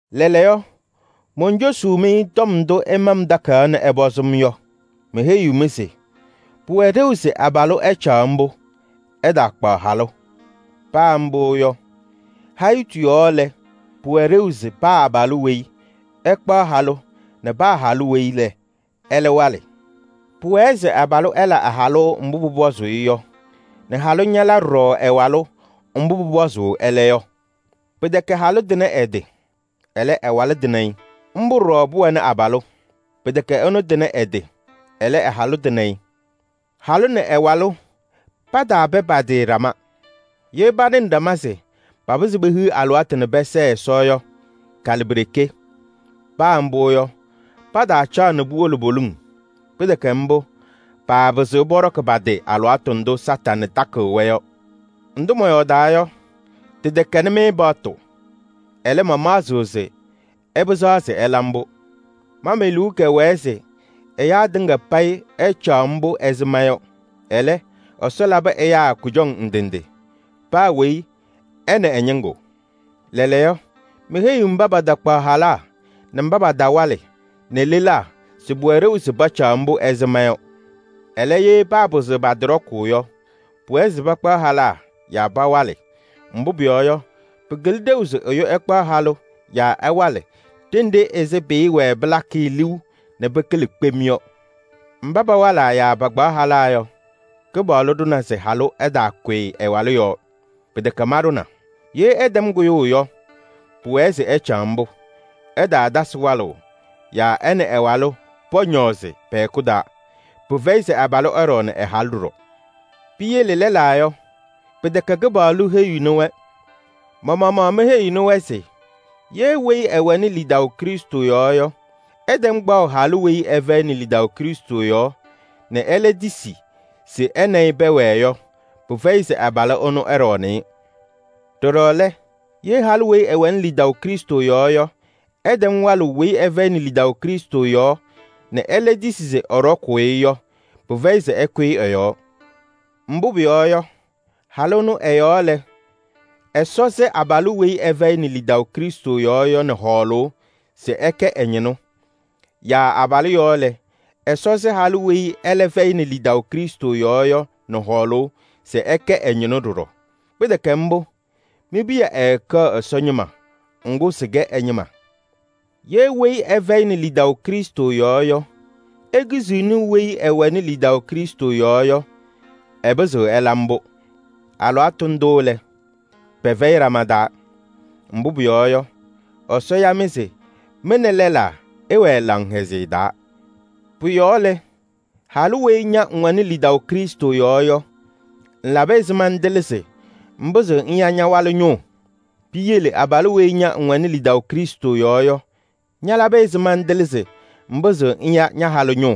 Lɛɛlɛɛyɔ, moncosuu-mɩ tɔm ndʋ ɩma-m takayaɣ nɛ ɩpɔzɩ-m yɔ. Meheyiɣ-mɩ se: pʋwɛ ɖeu se abalʋ ɛcaɣ mbʋ, ɛtaakpaɣ halʋ. Paa mbʋ yɔ, hayitu yɔɔ lɛ, pʋwɛ ɖeu se paa abalʋ weyi ɛkpaɣ halʋ nɛ paa halʋ weyi ɛlɛ walɩ. Pʋwɛɛ se abalʋ ɛla ɛ-halʋ mbʋ pʋpɔzʋʋ-ɩ yɔ nɛ halʋ ñala ɖɔɖɔ ɛ-walʋ mbʋ pʋpɔzʋʋ ɛlɛ yɔ. Pɩtɛkɛ halʋ tɩnɩ ɛ-tɩ, ɛlɛ, ɛ-walʋ tɩnɩ-ɩ. Mbʋ ɖɔɖɔ pʋwɛnɩ abalʋ. Pɩtɛkɛ ɛnʋ tɩnɩ ɛ-tɩ, ɛlɛ, ɛ-halʋ tɩnɩ-ɩ. Halʋ nɛ ɛ-walʋ pataapɛ pa-tɩ ɖama. Ye panɩnɩ ɖama se papɩzɩ pehiɣ alɩwaatʋ nɛ pɛsɛɛ Ɛsɔ yɔ, kalɩ pi-ɖeke. Paa mbʋ yɔ, pataacaɣ nɛ puwolo poliŋ. Pɩtɛkɛ mbʋ, paapɩzɩɣ pɔɖɔkɩ pa-tɩ alɩwaatʋ ndʋ Satanɩ takɩɣ-wɛ yɔ. Ndʋ mɔyɔɔdaa yɔ, tɩtɛkɛnɩ-mɩ paɣtʋ. Ɛlɛ, mamaɣzɩɣ se ɩpɩzaɣ se ɩla mbʋ. Ma me-liu kɛwɛɛ se ɛyaa tɩŋa payɩ ɛcaɣ mbʋ ɛzɩ ma yɔ. Ɛlɛ, Ɛsɔ labɩ ɛyaa kʋjɔŋ ndɩ ndɩ. Paa weyi ɛ nɛ ɛ-ñɩŋgʋ. Lɛɛlɛɛyɔ, meheyiɣ mba patakpaɣ halaa nɛ mba patawalɩ nɛ lelaa se pʋwɛ ɖeu se pacaɣ mbʋ ɛzɩ ma yɔ. Ɛlɛ, ye paapɩzɩɣ pa-tɩ ɖɔkʋʋ yɔ, pʋwɛɛ se pakpaɣ halaa yaa pawalɩ. Mbʋ pʋyɔɔ yɔ, pɩkɩlɩ ɖeu se ɛyʋ ɛkpaɣ halʋ yaa ɛwalɩ ɖenɖe ɛzɩ pɩɩwɛɛ pɩlakɩ-ɩ liu nɛ pɩkɩlɩ kpem yɔ. Mba pawalaa yaa pakpaɣ halaa yɔ, Kɩpaɣlʋ ɖʋna se halʋ ɛtaakʋyɩ ɛ-walʋ yɔɔ. Pɩtɛkɛ maɖʋna. Ye ɛtɛm kʋyʋʋ yɔ, pʋwɛɛ se ɛcaɣ mbʋ. Ɛtaatasɩ walʋʋ yaa ɛ nɛ ɛ-walʋ pɔñɔɔzɩ pɛ-hɛkʋ taa. Pɩfɛyɩ se abalʋ ɛɖɔɔnɩ ɛ-halʋ ɖɔɖɔ. Piyele lɛlaa yɔ, pɩtɛkɛ Kɩpaɣlʋ heyiɣni-wɛ. Ma-maɣmaɣ meheyiɣnɩ-wɛ se: ye weyi ɛwɛnɩ lidaʋ Krɩstʋ yɔɔ yɔ ɛtɛm kpaɣʋ halʋ weyi ɛfɛyɩnɩ lidaʋ Krɩstʋ yɔɔ nɛ ɛlɛ tisi se ɛ nɛ ɩ pɛwɛɛ yɔ, pɩfɛyɩ se abalʋ ɛnʋ ɛɖɔɔnɩ-ɩ. Ɖɔɖɔ lɛ, ye halʋ weyi ɛwɛnɩ lidaʋ Krɩstʋ yɔɔ yɔ ɛtɛm walʋʋ weyi ɛfɛyɩnɩ lidaʋ Krɩstʋ yɔɔ nɛ ɛlɛ tisi se ɛɖɔkʋʋ-ɩ yɔ, pɩfɛyɩ se ɛkʋyɩ ɛ-yɔɔ. Mbʋ pʋyɔɔ yɔ, halʋ ɛnʋ ɛ-yɔɔ lɛ, Ɛsɔ sɩ abalʋ weyi ɛfɛyɩnɩ lidaʋ Krɩstʋ yɔɔ yɔ nɛ hɔɔlʋʋ se ɛkɛ ɛ-ñɩnʋ. Yaa abalʋ yɔɔ lɛ, Ɛsɔ sɩ halʋ weyi ɛlɛ fɛyɩnɩ lidaʋ Krɩstʋ yɔɔ yɔ nɛ hɔɔlʋʋ se ɛkɛ ɛ-ñɩnʋ ɖɔɖɔ. Pɩtɛkɛ mbʋ, mi-piya ɛɛkɛɣ Ɛsɔ ñɩma, ŋgʋ sɩkɛ ɛ-ñɩma. Ye weyi ɛfɛyɩnɩ lidaʋ Krɩstʋ yɔɔ yɔ, ekiziɣni weyi ɛwɛnɩ lidaʋ Krɩstʋ yɔɔ yɔ, ɛpɩzɩɣ ɛla mbʋ. Alɩwaatʋ ndʋ lɛ, pɛfɛyɩ ɖama taa. Mbʋ pʋyɔɔ yɔ, Ɛsɔ ya-mɩ se mɩ nɛ lɛlaa ɩwɛɛ laŋhɛzɩyɛ taa. Pʋ-yɔɔ lɛ, halʋ weyi ña ŋwɛnɩ lidaʋ Krɩstʋ yɔɔ yɔ, ŋlabɩ ɛzɩma ŋtɩlɩ se ŋpɩzɩɣ ŋya ña-walʋ ñʋʋ? Piyele abalʋ weyi ña ŋwɛnɩ lidaʋ Krɩstʋ yɔɔ yɔ, ñalabɩ ɛzɩma ŋtɩlɩ se ŋpɩzɩɣ ŋya ña-halʋ ñʋʋ?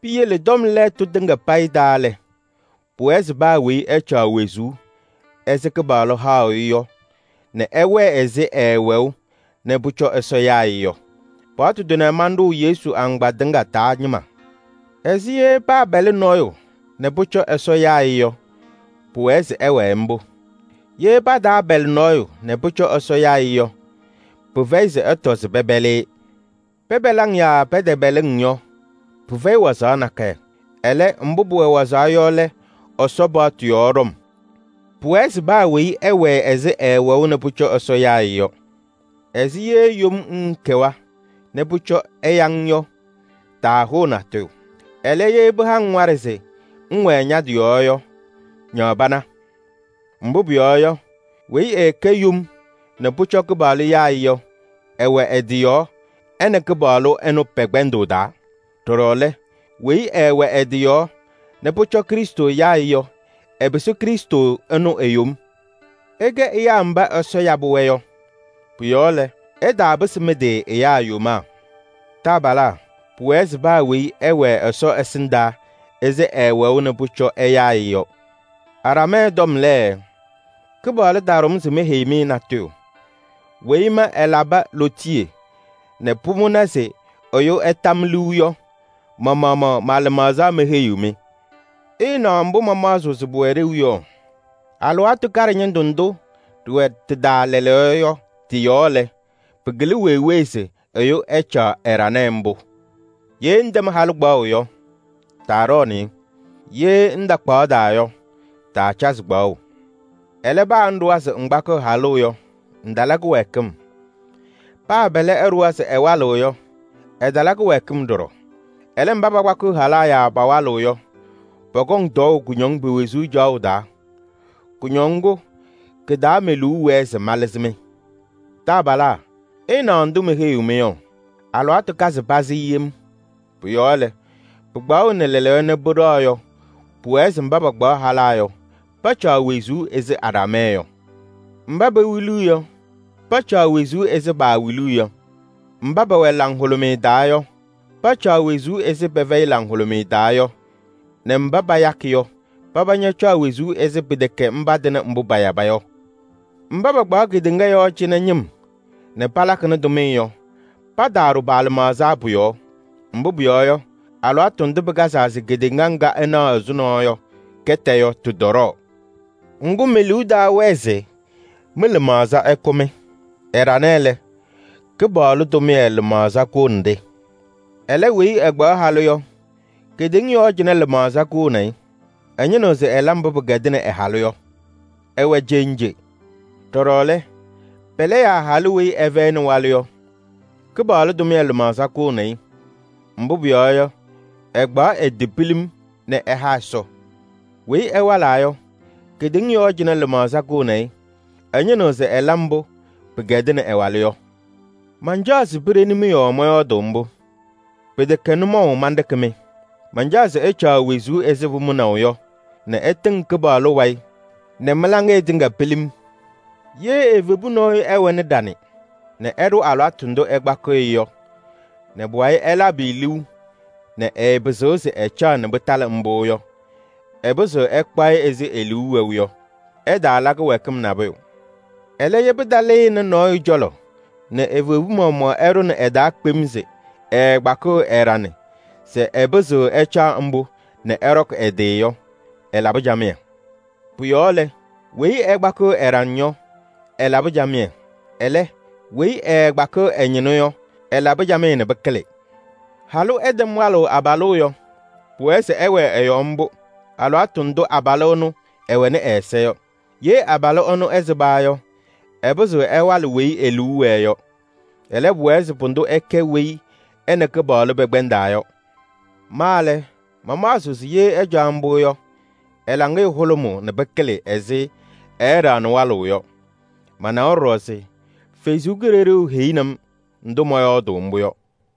Piyele tɔm lɛɛtʋ tɩŋa payɩ taa lɛ, pʋwɛɛ se paa weyi ɛcaɣ wezuu ɛzɩ Kɩpaɣlʋ haʋ-ɩ yɔ nɛ ɛwɛɛ ɛzɩ ɛɛwɛʋ nɛ pʋcɔ Ɛsɔ yaa-ɩ yɔ. Mbʋ manɖʋ Yesu agbaa tɩŋa taa ñɩma. Ɛzɩ ye paapɛlɩ nɔɔyʋ nɛ pʋcɔ Ɛsɔ yaa-ɩ yɔ, pʋwɛɛ se ɛwɛɛ mbʋ. Ye pataapɛlɩ nɔɔyʋ nɛ pʋcɔ Ɛsɔ yaa-ɩ yɔ, pɩfɛyɩ se ɛtɔ se pɛpɛlɩ-ɩ. Pɛpɛlɩ-ŋ yaa pɛtɛpɛlɩ-ŋ yɔ, pɩfɛyɩ wazaɣ nakɛyɛ. Ɛlɛ, mbʋ pʋwɛ wazaɣ yɔ lɛ Ɛsɔ paɣtʋ yɔɔ ɖɔm. Pʋwɛɛ se paa weyi ɛwɛɛ ɛzɩ ɛɛwɛʋ nɛ pʋcɔ Ɛsɔ yaa-ɩ yɔ. Ɛzɩ ye yom ŋŋkɛwa nɛ pʋcɔ ɛya-ŋ yɔ, taahʋʋ natʋyʋ. Ɛlɛ, ye pɩha-ŋ waɖɛ se ŋwɛɛ ña-tɩ yɔɔ yɔ, ñaɣ pana. Mbʋ pʋyɔɔ yɔ, weyi ɛɛkɛ yom nɛ pʋcɔ Kɩpaɣlʋ yaa-ɩ yɔ, ɛwɛ ɛ-tɩ yɔɔ ɛ nɛ Kɩpaɣlʋ ɛnʋ pɛ-kpɛndʋʋ taa. Ɖɔɖɔ lɛ, weyi ɛɛwɛ ɛ-tɩ yɔɔ nɛ pʋcɔ Krɩstʋ yaa-ɩ yɔ, ɛpɩsɩ Krɩstʋ ɛnʋ e-yom. Ɩkɛ ɛyaa mba Ɛsɔ yabɩ-wɛ yɔ. Pʋ-yɔɔ lɛ, ɩtaapɩsɩ mɩ-tɩ ɛyaa yomaa. Taabalaa, pʋwɛɛ se paa weyi ɛwɛɛ Ɛsɔ ɛsɩndaa ɛzɩ ɛɛwɛʋ nɛ pʋcɔ ɛyaa-ɩ yɔ. Aɖamɛɛ tɔm lɛ, Kɩpaɣlʋ taɖʋ-m se meheyi-mɩ natʋyʋ. Weyi ma ɛlabɩ lootiye nɛ pʋmʋna se ɛyʋ ɛta-m liu yɔ, ma-maɣmaɣ ma-lɩmaɣza meheyiɣ-mɩ. Ɩɩnaɣ mbʋ mamaɣzɩɣ se pʋwɛ ɖeu yɔ: alɩwaatʋ kaɖɛ ñɩndʋ ndʋ ɖɩwɛ tɩ-taa lɛɛlɛɛyɔ yɔ tɩ-yɔɔ lɛ, pɩkɩlɩ wee wee se ɛyʋ ɛcaɣ ɛɖanɛ mbʋ. Ye ŋtɛm halʋ kpaɣʋ yɔ, taaɖɔɔnɩ-ɩ. Ye ŋtakpaɣda yɔ, taacazɩ kpaɣʋ. Ɛlɛ, paa ŋɖʋwa se ŋkpakɩɣ halʋ yɔ, ŋtala kɩwɛɛkɩm. Paa pɛlɛ ɛɖʋwa se ɛwalɩɣ yɔ, ɛtala kɩwɛɛkɩm ɖɔɖɔ. Ɛlɛ, mba pakpakɩɣ halaa yaa pawalɩɣ yɔ, pɔkɔŋ tɔɔʋ kʋñɔŋ pe-wezuu caɣʋ taa. Kɩ-taa me-liu wɛɛ se malɩzɩ-mɩ. Taabalaa, ɩɩnaɣ ndʋ meheyiɣ-mɩ yɔ: alɩwaatʋ kazɩ pazɩ yem. Pʋ-yɔɔ lɛ, pɩkpaɣʋnɩ lɛɛlɛɛyɔ nɛ pɩɖɛɣ yɔ, pʋwɛɛ se mba pakpaɣ halaa yɔ, pacaɣ wezuu ɛzɩ aɖamɛɛ yɔ. Mba pewiliɣ yɔ, pacaɣ wezuu ɛzɩ paawiliɣ yɔ. Mba pɛwɛ laŋhʋlʋmɩyɛ taa yɔ, pacaɣ wezuu ɛzɩ pɛfɛyɩ laŋhʋlʋmɩyɛ taa yɔ nɛ mba payakɩ yɔ, paba ñacaɣ wezuu ɛzɩ pɛfɛyɩnɩ pʋyʋ yɔ. Mba pakpaɣ kedeŋa yɔɔ cɩnɛ ñɩm nɛ palakɩnɩ tʋmɩyɛ yɔ, pataaɖʋ pa-lɩmaɣza pʋ-yɔɔ. Mbʋ pʋyɔɔ yɔ, alɩwaatʋ ndʋ pɩkazaa se kedeŋa ŋga ɩnaɣ ɛzʋnɔ yɔ kɛtɛ yɔ, tɩtɔɖɔɔ. Ŋgʋ, me-liu taawɛɛ se mɩ-lɩmaɣza ɛkʋ-mɩ. Ɛɖanɛ lɛ, Kɩpaɣlʋ tʋmɩyɛ lɩmaɣza kʋʋnɩ-ɖɩ. Ɛlɛ, weyi ɛkpaɣ halʋ yɔ, kedeŋa yɔɔ cɩnɛ lɩmaɣza kʋʋnɩ-ɩ. Ɛñɩnɩɣ se ɛla mbʋ pɩkɛdɩnɩ ɛ-halʋ yɔ. Ɛwɛ cenje. Ɖɔɖɔ lɛ, pɛlɛ yaa halʋ weyi ɛfɛyɩnɩ walʋ yɔ, Kɩpaɣlʋ tʋmɩyɛ lɩmaɣza kʋʋnɩ-ɩ. Mbʋ pʋyɔɔ yɔ, ɛkpaɣ ɛ-tɩ pilim nɛ ɛha Ɛsɔ. Weyi ɛwalaa yɔ, kedeŋa yɔɔ cɩnɛ lɩmaɣza kʋʋnɩ-ɩ. Ɛñɩnɩɣ se ɛla mbʋ pɩkɛdɩnɩ ɛ-walʋ yɔ. Mancaɣ se piɖeni-mɩ yɔɔ mɔyɔɔdʋʋ mbʋ. Pɩtɛkɛ nʋmɔʋ manɖɩkɩ-mɩ. Mancaɣ se ɩcaɣ wezuu ɛzɩ pʋmʋnaʋ yɔ nɛ ɩtɩŋ Kɩpaɣlʋ wayɩ nɛ mɩ-laŋɩyɛ tɩŋa pilim. Ye evebu nɔɔyʋ ɛwɛnɩ ɖaŋ nɛ ɛɖʋ alɩwaatʋ ndʋ ɛkpakɩɣ-ɩ yɔ, nɛ pʋwayɩ ɛlabɩ-ɩ liu nɛ ɛɛpɩzɩɣ se ɛcaɣ nɛ pɩtalɩ mbʋ yɔ, ɛpɩzɩɣ ɛkpaɣ-ɩ ɛzɩ e-liu wɛʋ yɔ: ɛtala kɩwɛɛkɩm nabʋyʋ. Ɛlɛ, ye pɩtalɩnɩ nɔɔyʋ cɔlɔ nɛ evebu maɣmaɣ ɛɖʋnɩ ɛ-taa kpem se ɛɛkpakɩɣ ɛ-ɖaŋ se ɛpɩzɩɣ ɛcaɣ mbʋ nɛ ɛɖɔkɩ ɛ-tɩ yɔ, ɛlabɩ camɩyɛ. Pʋ-yɔɔ lɛ, weyi ɛkpakɩɣ ɛ-ɖaŋ yɔ, ɛlabɩ camɩyɛ. Ɛlɛ, weyi ɛɛkpakɩɣ ɛ-ñɩnʋ yɔ, ɛlabɩ camɩyɛ nɛ pɩkɩlɩ. Halʋ ɛtɛm walʋʋ abalʋ yɔ, pʋwɛɛ se ɛwɛɛ ɛ-yɔɔ mbʋ alɩwaatʋ ndʋ abalʋ ɛnʋ ɛwɛnɩ ɛ-ɛza yɔ. Ye abalʋ ɛnʋ ɛsɩba yɔ, ɛpɩzɩɣ ɛwalɩ weyi e-liu wɛɛ yɔ. Ɛlɛ, pʋwɛɛ se pʋdʋ ɛkɛ weyi ɛ nɛ Kɩpaɣlʋ pɛkpɛndaa yɔ. Ma lɛ, mamaɣzɩɣ se ye ɛcaɣ mbʋ yɔ, ɛ-laŋɩyɛ hʋlʋmʋʋ nɛ pɩkɩlɩ ɛzɩ ɛɛɖaɣnɩ walʋʋ yɔ. Manawa ɖɔɖɔ se Ɛsɔ Kalɩzaɣ heyini-m ndʋ mɔyɔɔdɩ mbʋ yɔ.